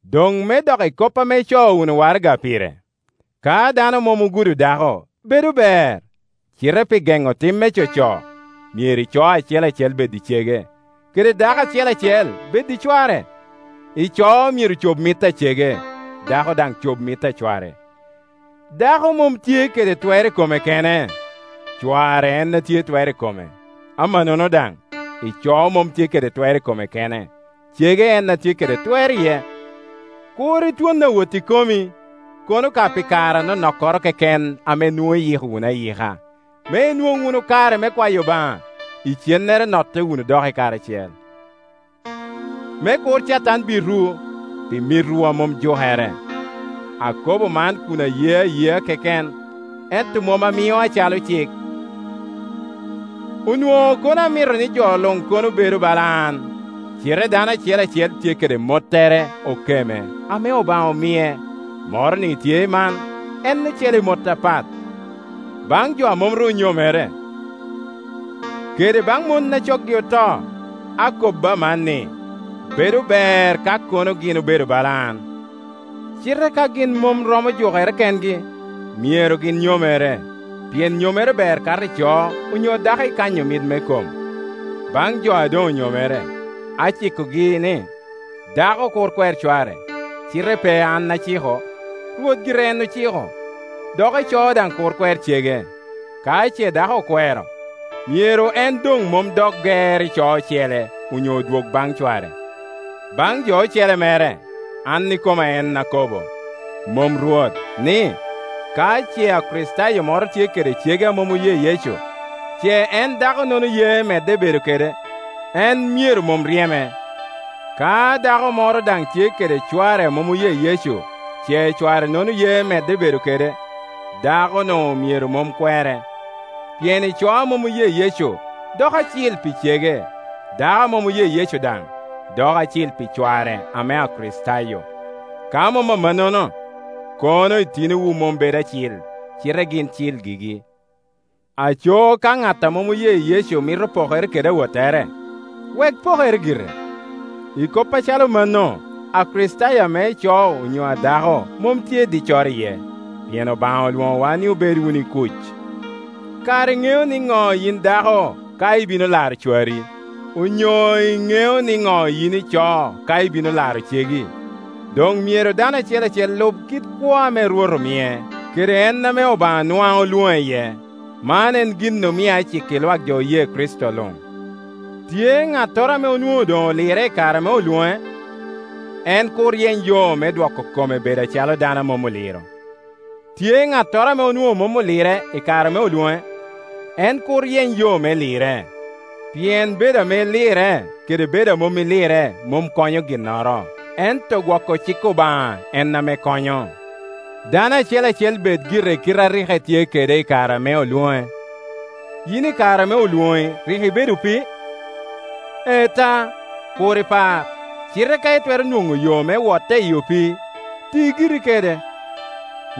Doŋ me dok i kop ame ico wunu waraga pire: Ka dano mom ogudo dako, bedo ber, cite pi geŋo tim me coco, myero ico acel acel bed i cege, kede dako acel acel bed i cware. Ico myero cob mit a cege, dako daŋ cob mit a cware. Dako mom tye kede twer i kome kene, cware en a tye i twer i kome; amanono daŋ, ico mom tye kede twer i kome kene, cege en a tye kede twer iye. Kur itwon awotti komi, kono ka pi kare anonokkoro keken ame nwoŋo iyiko wunu ayika, me inwoŋ wunu kare me kwayo Obaŋa. Icennere notte wunu doki karacel, me kur Catan bitwu, pi mitwu a mom jukere. Akobo man kun aye ayea keken, ento mom amio acalo cik. Onwoŋo kono amito ni jo luŋ kono obedo bala an-ni; cite dano acel acel tye kede mottere okeme, ame Obaŋa omie, moroni tye i man, en ocele i mot apat. Baŋ jo a mom ru onyomere, kede baŋ mon a coggi oto, akobo aman, ni, bedo ber ka kono gin obedo bala an. Cite ka gin mom romo jukere kengi, myero gin nyomere, pien nyomere ber kato ico onyo dako ikanyo mit me kom. Baŋ jo a doŋ onyomere, acikogi ni dako kur kwer cware, (cite pe an aciko, Rwot gire en ociko) dok ico daŋ kur kwer cege. Ka ce dako okwero, myero en doŋ mom dok ger ico ocele, onyo odwog baŋ cware. Baŋ jo ocele mere, an ikoma en akobbo, mom Rwot, ni, ka ce Akricitayo moro tye kede cege amom oye Yecu, ce en dako-nono ye medde bedo kede, en myero mom ryeme. Ka dako moro daŋ tye kede cware a mom oye Yecu, ce cware-nono ye medde bedo kede, dako-nu myero mom kwere. Pien ico a mom oye Yecu doko acil pi cege, dako a mom oye Yecu daŋ doko acil pi cware ame Akricitayo. Ka mom amannono, kono itinowu mom bedo acil, cite gin cil gigi. Aco ka ŋat a mom oye Yecu mito pokere kede awottere, wek pokere gire. I kop acalo mano Akricitayo ame ico onyo a dako mom tye diccoro iye, pien Obaŋa olwoŋowa ni obed wunu i kuc. Kara iŋeo niŋo, yin dako, ka ibino laro cwari? Onyo iŋeo niŋo, yin ico, ka ibino laro cegi? Doŋ myero dano acel acel lub kit kwo ame Rwot omie, kede en ame Obaŋa nwaŋ olwoŋe iye. Man en gin ame aciko i lwak jo oye Kricito luŋ. Tye ŋattoro ame onwoŋo doŋ olirre i kare ame olwoŋe? En kur yeny yo me dwoko kome bedo acalo dano a mom oliro. Tye ŋattoro ame onwoŋo mom olirre i kare ame olwoŋe? En kur yeny yo me lirre. Pien bedo ame ilirre kede bedo a mom ilirre mom konyo ginnoro; ento gwoko cik Obaŋa en ame konyo. Dano acel acel bed gire i kite a rik etye kede i kare ame olwoŋe. Yin i kare ame olwoŋi rik ibedo opii? Ee ta, kur ipar. Cite ka itwero nwoŋo yo me wotte i opii, ti giri kede.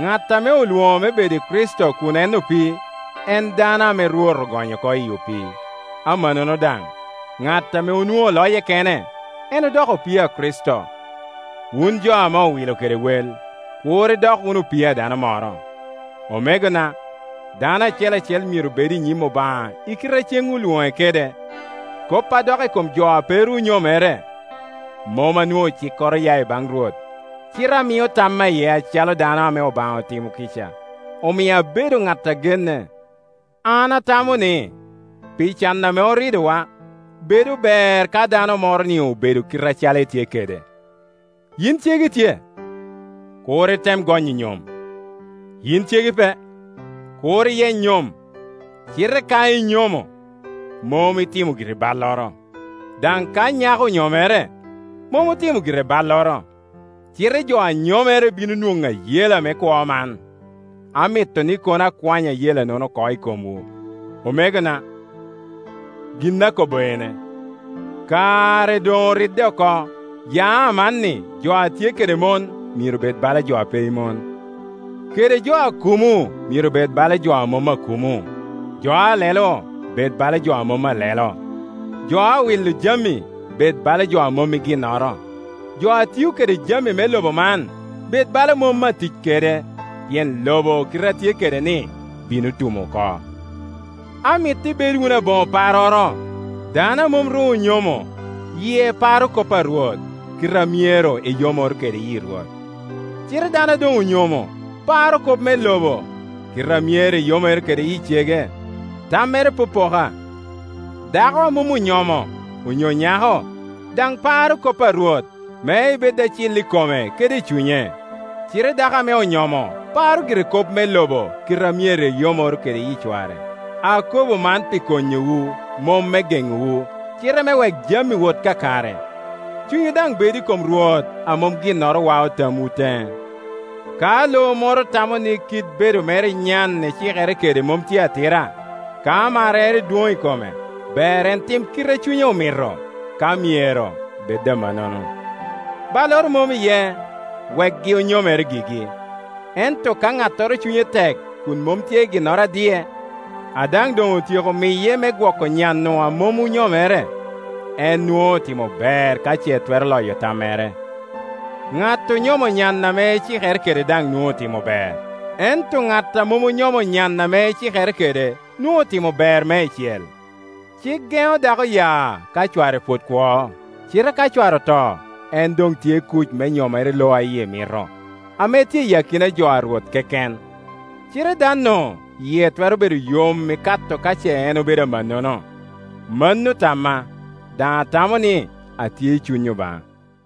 Ŋat ame olwoŋo me bedo i Kricito kun en opii, en dano ame Rwot ogonyo oko i opii. Amannono daŋ, ŋat ame onwoŋo loye kene, en odoko opii a Kricito. Wun jo ame owilo kede wel; kur idok wunu opii a dano moro. Omegona, dano acel acel myero bed i nyim Obaŋa i kite a ceŋ olwoŋe kede. Kop a dok i kom jo a pe ru onyomere, mom anwoŋo cikkoro oya i baŋ Rwot, cite amio tamma iye acalo dano ame Obaŋa otimo kica, omio abedo ŋat a genne. An atamo ni, pi can ame oridowa, bedo ber ka dano moro-ni obedo kite acalo etye kede. Yin cegi tye? Kur item gonyo nyom. Yin cegi pe? Kur iyeny nyom. Cite ka inyomo, mom itimo giri balloro. Daŋ ka nyako onyomere, mom otimo gire balloro. Cite jo a nyomere bino nwoŋo ayela me kwo man, amito ni kono akwanyo ayela-nono oko i komwu. Omegona, gin akobo ene, kare doŋoridde oko; ya amanni jo a tye kede mon myero bed bala jo a pe i mon, kede jo a kumo myero bed bala jo a mom akumo, jo a lelo bed bala jo a mom alelo, jo a wilo jami bed bala jo a mom i ginnoro, jo a tio kede jami me lobo man bed bala mom atic kede, pien lobo kite a tye kede-ni bino tum oko. Amito ibed wunu aboŋo parroro. Dano a mom ru onyomo, yie paro kop a Rwot, kite a myero eyomoro kede yi Rwot. Cite dano a doŋ onyomo paro kop me lobo, kite a myero eyomoro kede yi cege, tammere popoka. Dako a mom onyomo, onyo nyako, daŋ paro kop a Rwot, me ebed acil i kome kede i cunye. Cite dako ame onyomo paro gire kop me lobo, kite a myero eyomoro kede yi cware. Akobo man pi konyowu, mom me geŋowu, cite me wek jami wot kakare, cunywu daŋ bed i kom Rwot a mom ginnoro wao tamwu teŋe. Ka lo moro tamo ni kit bedo mere i nyan ecikere kede mom tye atira, ka marrere dwon i kome, ber en tim kite a cunye omito, ka myero bed amannono. Balloro mom iye, wekgi onyomere gigi. Ento ka ŋattoro cunye tek kun mom tye ginnoro a diye, a daŋ doŋ otyeko miye me gwoko nya-nu a mom onyomere, en nwoŋo otimo ber ka ce twero loyo tammere. Ŋat onyomo nyan ame ecikere kede daŋ nwoŋo otimo ber, ento ŋat a mom onyomo nyan ame ecikere kede nwoŋo otimo ber meicel. Cik geŋo dako ya ka cware pwod kwo, cite ka cware oto, en doŋ tye i kuc me nyomere i lo a yie mito, ame tye i akina jo a Rwot keken. Cite dan-nu yie twero bedo yom ikato ka ce en obedo amannono; mano tamma, daŋ atamo ni atye i Cuny Obaŋa.